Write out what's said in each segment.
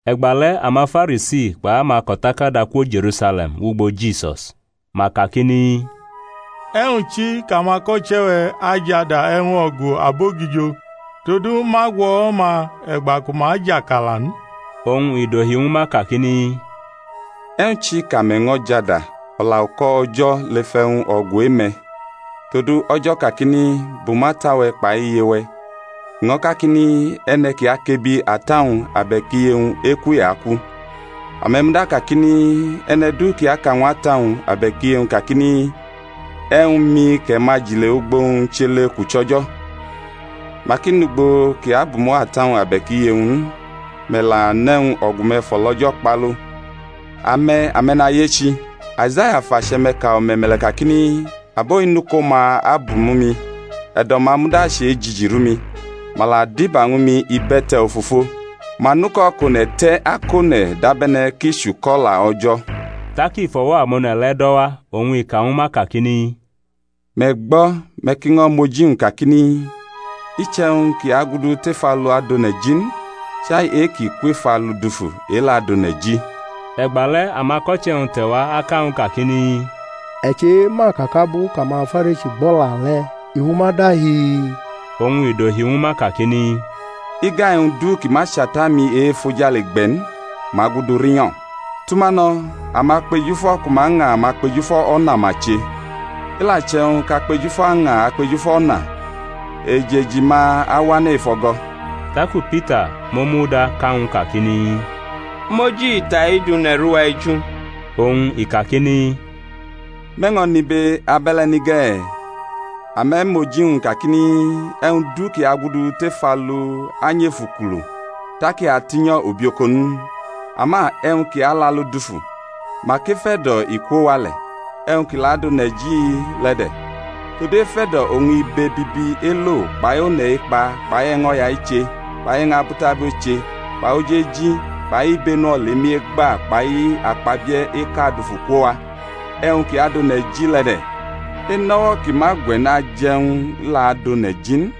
E̩gba le̩ amaFarisi kpai amako̩takada kwo Je̩rusale̩m wʼugbo Jisus. Ma kakini, E̩wñ chi kʼamako̩che̩-we̩ ajʼada e̩wñ o̩gu abogijo? Todu ma gwʼo̩wo̩-ma e̩gba ku ma jʼakala n. Oñ i dohi ñwu ma kakini, E̩wñ chi kʼame̩ ño̩ jʼada o̩la-uko̩ O̩jo̩ lef e̩wñ o̩gu e-me̩? Todu O̩jo̩ kakini, Bumʼata-we̩ kpai iye-we̩; i ño̩ kakini, E̩ne̩ ki akʼebi ata-wñ abe̩k iye-wñ, eku i aku. Ame̩ muda kakini, E̩ne̩ du ki aka ñw ata-wñ abe̩k iye-wñ kakini, E̩wñ-mi kʼe̩ ma jʼile ugbo-wñ chʼele kʼu chʼO̩jo̩; mak i nʼugbo kʼi abumo̩ata-wñ abe̩k iye-wñ n. Me̩ la nʼe̩wñ o̩gu-me̩ fʼo̩lO̩jo̩ kpalu. Ame̩, ame̩nayechi, Aizaya fʼache̩-me̩ ka o̩me̩me̩le̩ kakini, Abo-i nʼuko-ma abumo̩ mi, e̩do̩-ma muda chejiji rʼumi. Ma la diba ñwu mi ibe̩te̩ ofofo, ma nʼuko̩ kʼone̩ te̩ akʼone̩ dabe̩ne̩ ki chʼuko̩-o̩la O̩jo̩. Tak i fʼo̩wo̩ amone̩ le̩ do̩ wa oñ i ka ñwu ma kakini, Me̩ gbo̩, me̩ ki ño̩ mʼoji-wñ, kakini, I chʼe̩wñ ki agudu tef alu adʼone̩ ji n; chai e-kʼi kwef alu dufu, e-le̩ adʼone̩ ji. E̩gba le̩ amako̩che̩-wñ te̩wa aka ñw u kakini, E̩ chema ka kʼabu kʼamaFarisi gbʼo̩la le̩ i fʼuma dahi? Oñ i dohi ñwu ma kakini, Iga e̩wñ du kʼi ma chʼAta-mi e-efojale gbe̩ n, ma agudu rinyo̩ Tʼuma no̩; amakpejufo̩ ku ma ña amakpejufo̩ o̩na ma che. I la che̩wñ kʼakpejufo̩ aña akpejufo̩ o̩na, ejeji-ma awane̩ ef o̩go̩. Taku Pita mʼomu da ka ñw u kakini, Mʼoji ita-i du ne̩rʼuwaeju. Oñ i kakini, Me̩ ño̩ nʼibe abe̩le̩ ni ge̩? Ame̩ mʼoji-wñ kakini, E̩wñ du ki agudu tef alu anyʼef ukulu, tak i atinyo̩ ubioko n? Ama e̩wñ ki alʼalu dufu, mak ef e̩do̩ i kwo wa le̩; e̩wñ ki la adʼone̩ ji le̩ de̩. Todu ef e̩do̩ oñ ibe bibi elo kpai one̩ ekpa kpai e̩ño̩ya eche kpai e̩wñ abutabu eche kpai oji eji kpai ibenu olemi egba kpai akpabie̩ eka adufu kwo wa. E̩wñ ki adʼone̩ ji le̩ de̩. Enʼo̩wo̩ ki ma gwe̩ n aje̩ e̩wñ la adʼone̩ ji n.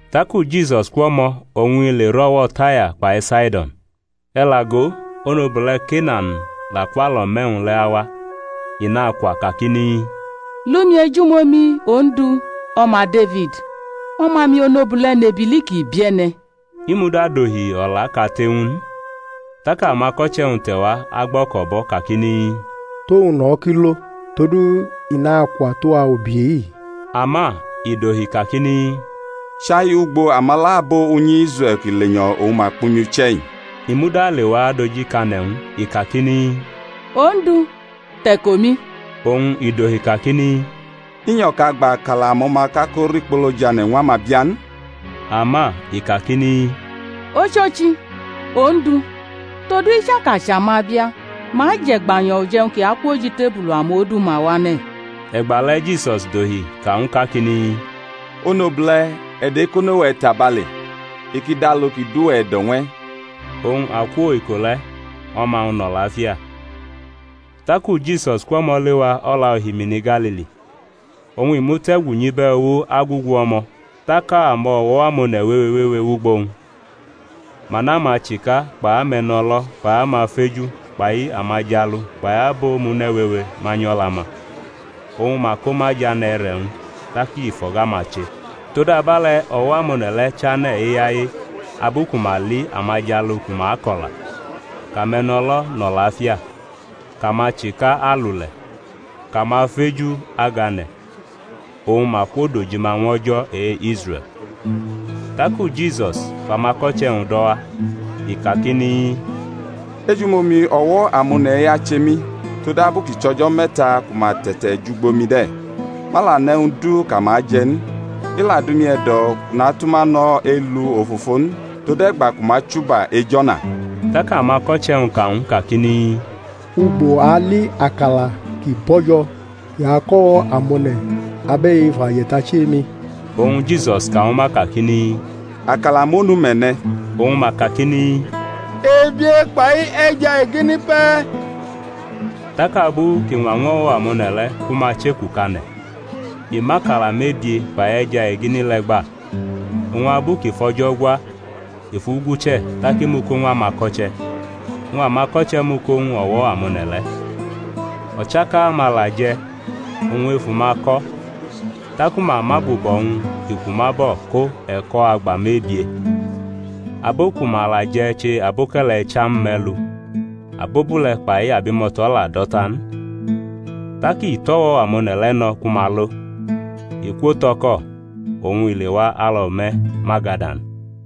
Taku Jisus kwʼo̩mo̩ oñ i le rʼo̩wo̩ Taya kpai Saido̩n. E̩ la go, onobule̩ Kenan la kwʼalo̩me̩-wñ le̩ awa; i nakwa kakini, Li umi ejumomi, Ondu, O̩ma Defid! o̩ma-mi onobule̩ nʼebili kʼi bie̩ne̩. I muda dohi o̩laʼkate ñw u n. Tak amako̩che̩-wñ te̩wa agbo̩ko̩bʼo̩ kakini, Tʼowñ no̩ kʼi lo, todu i nakwa tʼuwa ubi-i. Ama i dohi kakini, Chai ugbo amala abo unyi Israe̩l ki lenyo̩ oñ ma kpʼumi uche̩-i. I muda lewa adojikane̩ ñw u, i kakini, Ondu, te̩ko mi. Oñ i dohi kakini, I nyo̩ kʼa gba akala amo̩ma kʼa ko rikpolo jʼane̩ ñw amabia n. Ama i kakini, Ochochi, Ondu; todu i chaka chʼamabia ma je̩ e̩gbanyo̩ uje̩wñ ki akwʼoj itebulu amodu-ma wane̩. E̩gba le̩ Jisus dohi ka ñw u kakini, Onobule̩, e̩do̩ ekono-we̩ tabale; i ki dʼalu ki dʼuwe̩ e̩do̩ ñw e̩. Oñ akwo iko le̩ o̩ma-wñ nʼo̩lafia. Taku Jisus kwʼo̩mo̩ lewa o̩la ohimini Galili, oñ i mute̩gu nyʼibe̩ uwo agugu o̩mo̩. Tak amo̩wo̩ amone̩ wewe wewe wʼugbo-wñ. Ma nʼamachika kpai ame̩no̩lo̩ kpai amafeju kpai amajalu kpai abo omune̩ wewe manyu o̩la-ma, oñ ma ko ma jʼane̩ e̩re̩-wñ; tak i fʼo̩ga-ma che. Todabe̩le̩ o̩wo̩ amone̩ le̩ chane̩ eyaye abu ku ma li amajalu ku ma ako̩la, kʼame̩no̩lo nʼo̩lafia, kʼamachika alule̩, kʼamafeju agane̩; oñ ma kwodojima ñw O̩jo̩ e-Israe̩l. Taku Jisus fʼamako̩che̩-wñ do̩ wa, i kakini, Ejumomi o̩wo̩ amone̩-i ache mi, todabu kʼi chʼo̩jo̩ me̩ta ku ma te̩te̩jʼugbo mi de̩. Ma la nʼe̩wñ du kʼama aje̩ n; i la dʼumi e̩do̩ kʼu natʼuma no̩ elu ofofo n, tode̩gba ku ma achuba ej o̩na. Tak amako̩che̩-wñ ka ñw u kakini, Ugbo a ali akala ki bo̩jo̩ ki ako̩ o̩wo̩ amone̩ abe̩i efu aje̩tachi emi? Oñ Jisus ka ñwu ma kakini, Akala monu me̩ ne̩? Oñ ma kakini, Ebie, kpai e̩ja egini pe̩e̩. Tak abu kʼi ñwa ñw o̩wo̩ amone̩ le̩ ku ma chekukʼane̩, i mʼakala mebie kpai e̩ja egini le̩ gba, oñ abu kʼi fʼO̩jo̩ gwa i fʼu guche̩ tak i mʼu ko ñw amako̩che̩, oñ amako̩che̩ mʼu ko ñw o̩wo̩ amone̩ le̩. O̩chaka-ma la je̩, oñ efu-ma ko̩. Taku ma mʼabubo̩-wñ ki kwu ma bo̩ ko e̩ko̩ agba mebie. Abo ku ma la je̩ che aboke̩le̩ icham me̩lu, abobule̩ kpai abimo̩to̩ la do̩ ta n. Tak i tʼo̩wo̩ amone̩ le̩ no̩ ku ma lo; i kwo tʼo̩ko̩, oñ i lewa alo̩me̩ Magadan.